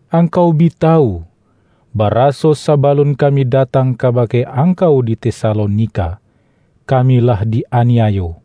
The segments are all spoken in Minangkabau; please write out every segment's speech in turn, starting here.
Angkau bi ta-wu, baraso sabalun kami datang ka-bake angkau di Tesalonika, kami lah di-aniayo,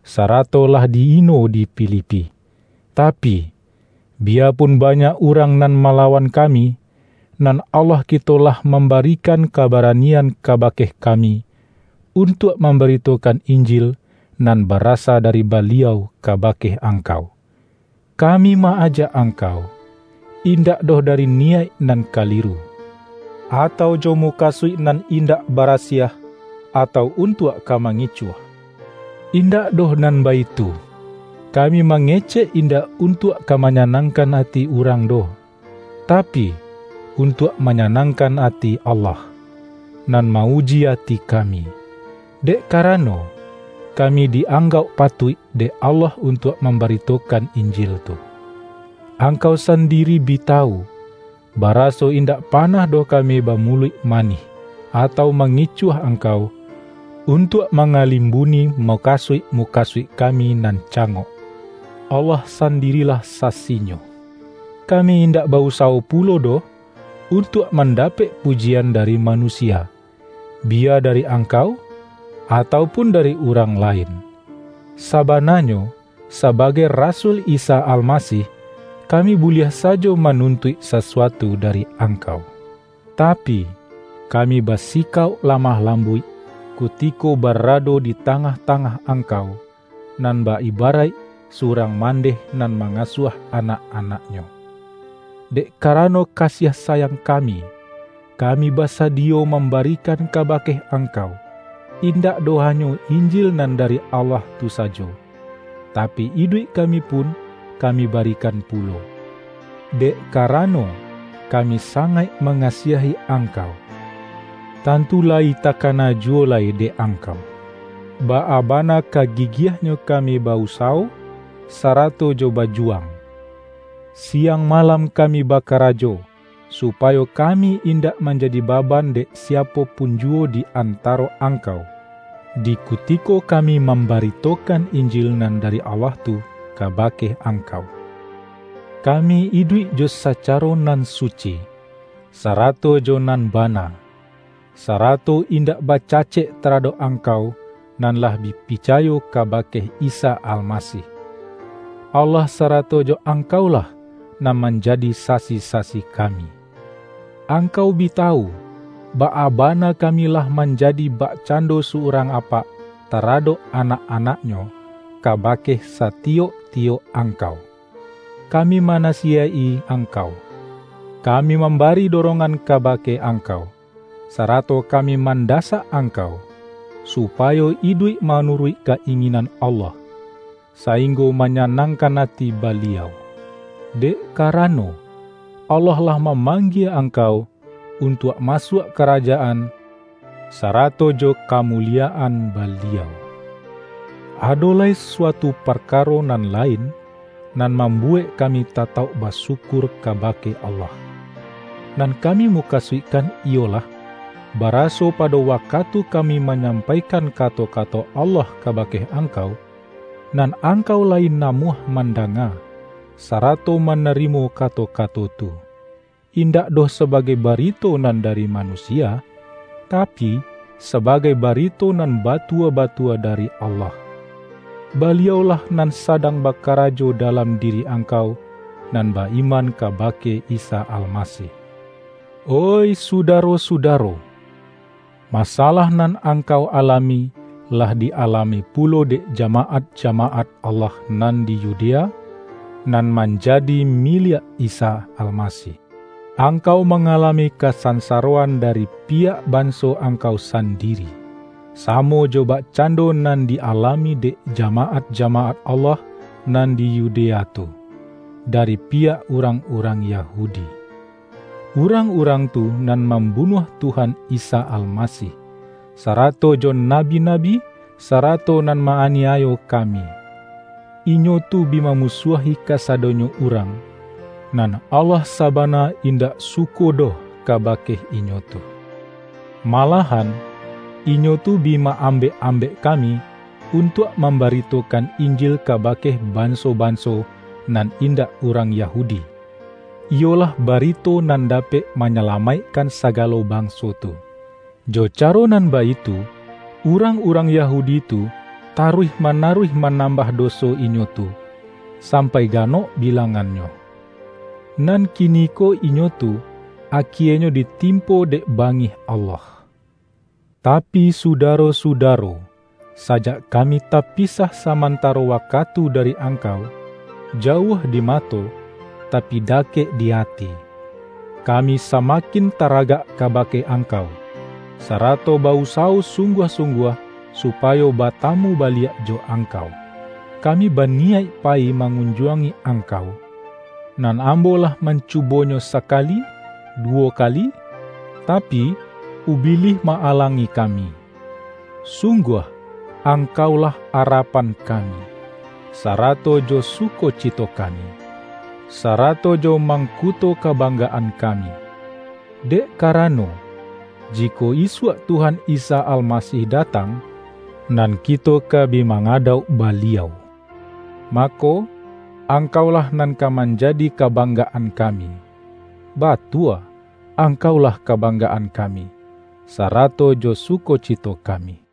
sarato lah di-ino di Fili-pi. Tapi, biyapun banyak urang nan malawan kami, nan Allah kito lah mambarikan kabaranian kabake ka-mi, untuak mambaritokan Injil nan barasa dari Baliau kabake angkau. Kami ma-ajak angkau, indak doh dari niyaik nan kaliru; atau jo mu-kasuik nan indak barasiah, atau un-tuak ka mangicuah. Indak doh nan baitu! Kami mangecek indak untuak ka manyanangkan ati urang doh, ta-pi, untuak manyanangkan ati Allah, nan ma-uji ati kami. Dek karano, ka-mi di-anggauk patuik dek Allah un-tuak mambaritokan Injil tu. Angkau sandiri bi tawu, baraso indak panah doh kami bamuluik manih, atau ma-ngicuah angkau, untuak mangalim-buni mukasuik-mukasuik kami nan cangok. Allah sandirilah sasinyo! Kami indak ba-usawo pulo doh, un-tuak mandapek pujian dari manu-sia — biya dari angkau, atau pun dari urang lain. Sabananyo sabagai rasul Isa Almasih, kami buliah sajo manun-tuik sasuatu dari angkau. Tapi, kami basikauk lamah lambuik kutiko ba-rado di tangah-tangah angkau, nan bak ibaraik surang mandeh nan ma-ngasuah anak-anaknyo. Dek karano kasiah sayang kami, kami basadiyo mambarikan kabake angkau, indak doh hanyo Injil nan dari Allah tu sa-jo, tapi, iduik kami pun kami bari-kan pulo. Dek karano, kami sangaik mangasiahi angkau! Tantu layi ta-kana juwo lai dek angkau, baa bana ka gigiahnyo kami ba-usawo, sarato jo bajuwang. Siang malam kami ba-karajo, supayo kami indak manjadi baban dek siapo pun juwo di anta-ro angkau, di kutiko kami mamba-ritokan Injil nan dari Allah tu kaba-ke angkau. Kami iduik jo sacaro nan suci, sa-rato jo nan bana, sarato indak baca-cek taradok angkau nan lah bi pica-yo kabake Isa Almasih. Allah sarato jo angkaulah, nan manjadi sasi-sasi kami. Angkau bi tawu, baa bana kami lah manjadi bakcando surang apak taradok anak-anaknyo, kabake satiyok-tiyok angkau. Kami mana-siyaik-i angkau, kami mambari do-rongan kabake angkau, sarato kami mandasak angkau, supayo iduik ma-nuruik ka-inginan Allah, sainggo ma-nyanangkan ati Baliau. Dek karano, Allah lah mamanggie angkau, untuak masuak Karajaan, sarato jo kamuli-yaan Baliau. Ado lai suatu parkaro nan lain, nan mambuwek kami tatauk basyu-kur kabake Allah. Nan kami muka-suikkan iyolah, baraso pado wakatu kami manyampaikan kato-kato Allah kabake angkau, nan angkau layi na-muah mandanga, sarato manarimo kato-kato tu, indak doh sabagai ba-rito nan dari manusia, tapi, sabagai barito nan batua-batua dari Allah. Baliau-lah nan sadang bakarajo da-lam diri angkau nan ba-iman kaba-ke Isa Almasih. Oih sudaro-sudaro, masalah nan angkau alami, lah di-alami pulo dek jamaat-jamaat Allah nan di Yudea, nan manjadi miliak Isa Almasih. Angkau mangalami kasan-saroan dari piyak banso angkau san-diri, samo jo bakcando nan di-alami dek jamaat-jamaat Allah nan di Yu-dea tu, dari piyak urang-urang Ya-hudi. Urang-urang tu nan mam-bunuah Tuhan Isa Almasih, sarato jo nabi-nabi, sarato nan ma-aniayo ka-mi. Inyo tu bi mamusuahi kasado-nyo urang, nan Allah sabana indak suko doh kabake inyo tu. Malah-an inyo tu bi ma-ambek-ambek kami untuak mambaritokan Injil kabake banso-banso nan indak urang Yahu-di, iyolah barito nan dapek manyalamaikkan sagalo banso tu. Jo caro nan baitu, urang-urang Yahudi tu ta-ruih manaruih manambah doso inyo tu, sampai ganok bilangannyo. Nan kiniko inyo tu, akienyo ditimpo dek bangih Allah! Tapi sudaro-sudaro, sajak kami tapisah samantaro wakatu dari ang-kau — jauah dimato, tapi dakek di ati — kami samakin taragak kabake angkau, sarato ba-usawo sungguah-sungguah supayo batamu baliak jo angkau! Kami baniyaik payi ma-ngunjuangi angkau; nan ambo lah mancubonyo sakali, duwo kali, tapi, Ubilih ma-alangi kami. Sungguah, angkaulah arapan kami, sarato jo su-kocito kami, sarato jo mangkuto ka-banggaan kami. Dek karano, jikok isuak Tuhan Isa Almasih datang, nan kito ka bi mangadauk Baliau, mako, angkaulah nan ka manjadi kabang-gaan kami! Batua, angkaulah ka-banggaan kami, sarato jo sukocito kami!